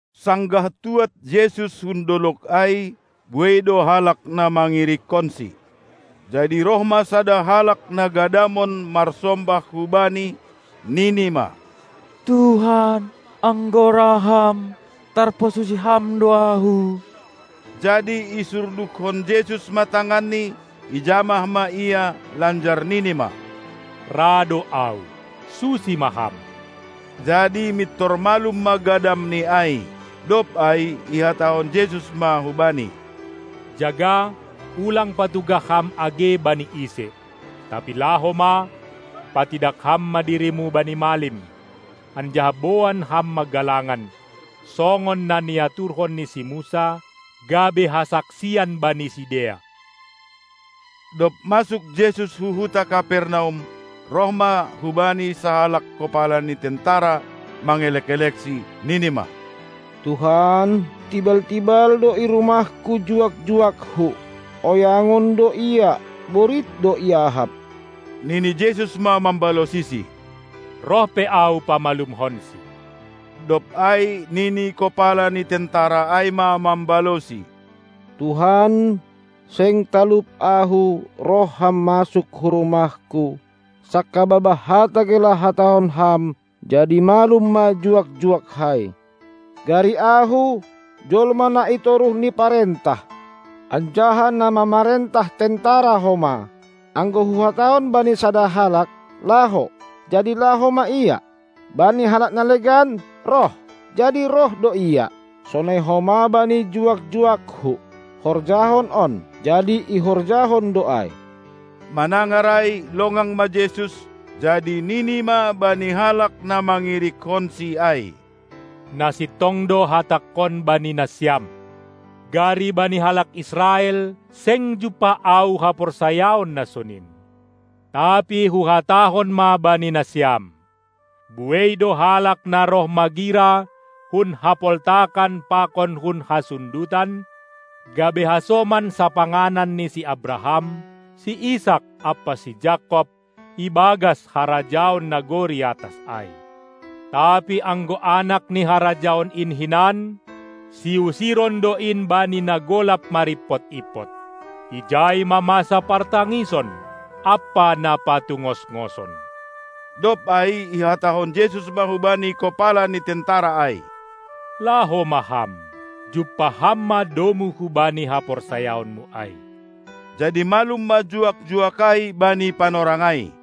Sanggah tuad Jesus hun dolog ai, buei do halak na mangirikkonsi. Jadi roh ma sada halak na gadamon marsombah hu-Bani, nini ma: Tuhan, anggo ra Ham, tarpasusi Ham do ahu! Jadi isurdukkon Jesus ma tanganni, ijamah ma ia lanjar nini ma: Ra do Ahu, susi ma ham! Jadi mintor malum ma gadamni ai. Dob ai ihatahon Jesus ma hubani: Jaga, ulang patugah ham age bani ise. Tapi laho ma, patidak ham ma dirimu bani malim, anjaha boan ham ma galangan, songon na niaturhon ni si Musa, gabe hasaksian bani sidea. Dob masuk Jesus hu huta Kapernaum, roh ma hubaNi sahalak kopala ni tentera mangelek-elekSi, nini ma: Tuhan, tibal-tibal do i rumahku juak-juakku, oyangon do ia, borit do iahap. Nini Jesus ma mambalosisi: Roh pe Ahu pamalumhonsi. Dob ai nini kopala ni tentera ai ma mambalosi: Tuhan, seng talup ahu, roh ma Ham masuk hu rumahku; sangkababah hata gelah hatahon Ham, jadi malum ma juak-juakkai. Gari ahu, jolma na i toruh ni parentah, anjaha na mamarentah tentara homa, anggo huhatahon bani sada halak: "Laho", jadi laho ma ia; bani halak na legan "Roh", jadi roh do ia; sonai homa bani juak-juakku "Horjahon on", jadi ihorjahon do ai. Manangar ai, longang ma Jesus, jadi nini ma bani halak na mangirikkonSi ai: Na sintong do hatangkon bani nasiam: Gari bani halak Israel seng jumpah Ahu haporsayaon na sonin. Tapi Huhatahon ma bani nasiam: Buei do halak na roh magira hun hapoltakan pakon hun hasundutan gabe hasoman sapanganan ni si Abraham, si Isak ampa si Jakob ibagas harajaon nagori atas ai. Tapi anggo anak ni harajaon in hinan, siusiron do in bani na golap marimpot-impot; ijai ma masa partangison ampa na patungos-ngoson. Dob ai ihatahon Jesus ma hubani kopala ni tentera ai: Laho ma ham, jumpah ham ma domu hubani haporsayaonmu ai! Jadi malum ma juak-juak ai bani panorang ai.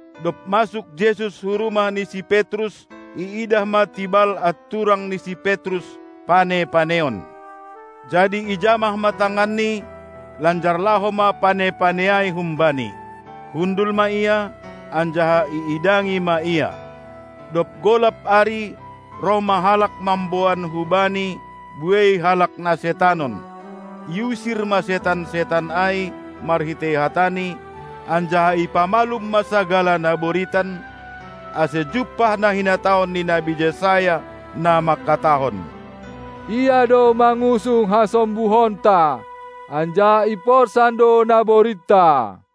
Dob masuk Jesus hu rumah ni si Petrus, iidah ma tibal anturang ni si Petrus, pane-paneon. Jadi ijamah ma tanganni, lanjar laho ma pane-pane ai humbani. Hundul ma ia, anjaha iidangi ma Ia. Dob golap ari, roh ma halak mamboan hu-Bani buei halak na setanon. Iusir ma setan-setan ai marhitei hataNi, anjaha ipamalum ma sagala na boritan, ase jumpah na hinatahon ni nabi Jesaya, na mangkatahon: Ia do mangusung hasombuhonta anjaha iporsan do naboritta.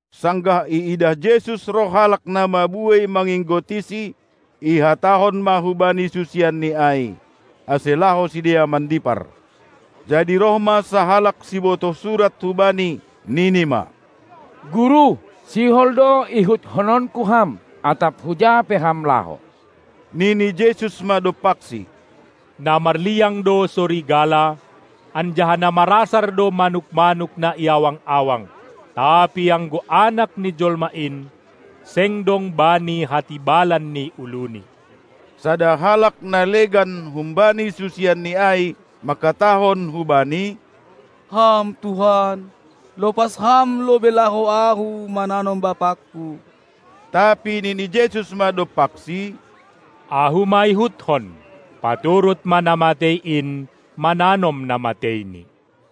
Sanggah iidah Jesus roh halak na mabuei manginggotiSi, ihatahon ma hubani susianNi ai, ase laho sidea mandipar. Jadi roh ma sahalak sibotoh surat hu Bani, nini ma: Guru, sihol do ihutkononku Ham, atap huja pe Ham laho! Nini Jesus ma dompaksi: Na marliang do sorigala, anjaha na marasar do manuk-manuk na i awang-awang, tapi anggo Anak ni Jolma in, seng dong Bani hatibalan ni uluNi. Sada halak na legan humbani susianNi ai mangkatahon hu Bani: Ham Tuhan, lopas Ham lobei laho ahu mananom bapangku! Tapi nini Jesus ma dompaksi: Ahu ma ihutkon! Paturut ma na matei in mananom na mateini!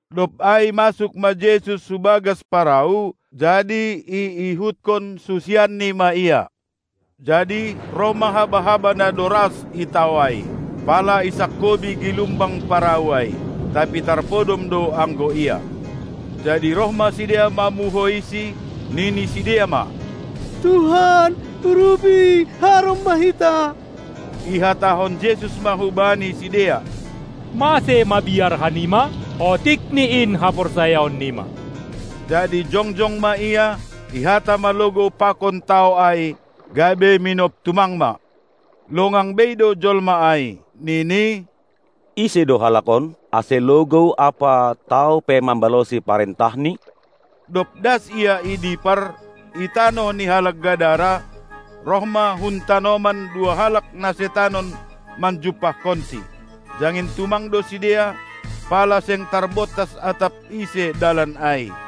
Dob ai masuk ma Jesus hu bagas parau, jadi iihutkon susianNi ma Ia. Jadi roh ma haba-haba na doras i tao ai, pala isangkobi gilumbang parau ai, tapi tarpodom do anggo Ia. Jadi roh ma sidea mamuhoiSi, nini sidea ma: Tuhan, urupi, harom ma hita! Ihatahon Jesus ma hubani sidea: Mase mabiar hanima? Otikni in haporsayaonnima! Jadi jongjong ma Ia, ihata ma logou pakon tao ai, gabe minop tumang ma. Longang bei do jolma ai, nini: Ise do halak on, ase logou ampa tao pe mambalosi parentahNi? Dob das Ia i dipar, i tanoh ni halak Gadara, roh ma hun tanoman dua halak na setanon manjumpahkonSi. Jangin tumang do sidea, pala seng tarbontas atap ise dalan ai.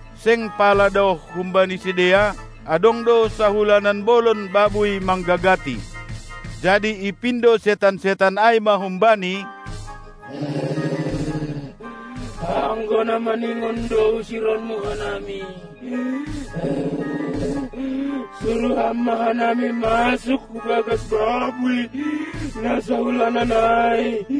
Seng pala daoh humbani sidea adong do sahulanan bolon babuy manggagati. Jadi ipindo setan-setan ai ma hum-Bani: Anggo na maningon do usironMu hanami, suruh Ham ma hanami masuk hu bagas babuy na sahulanan ai.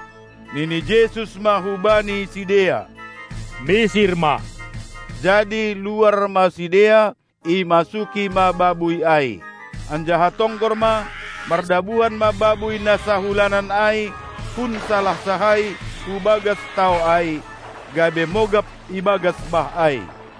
Nini Jesus ma hubani sidea: Misir ma! Jadi luar ma sidea, imasuki ma babuy ai. Anjaha tonggor ma, mardabuhan ma babuy na sahulanan ai hun salansah ai hu bagas tao ai, gabe mogap ibagas bah ai.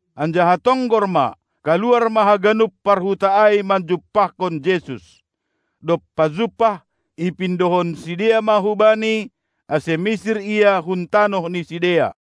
Anjaha tonggor ma, kaluar ma haganup parhuta ai manjumpahkon Jesus. Dob pajumpah, ipindohon sidea ma hu-Bani, ase misir Ia hun tanoh ni sidea.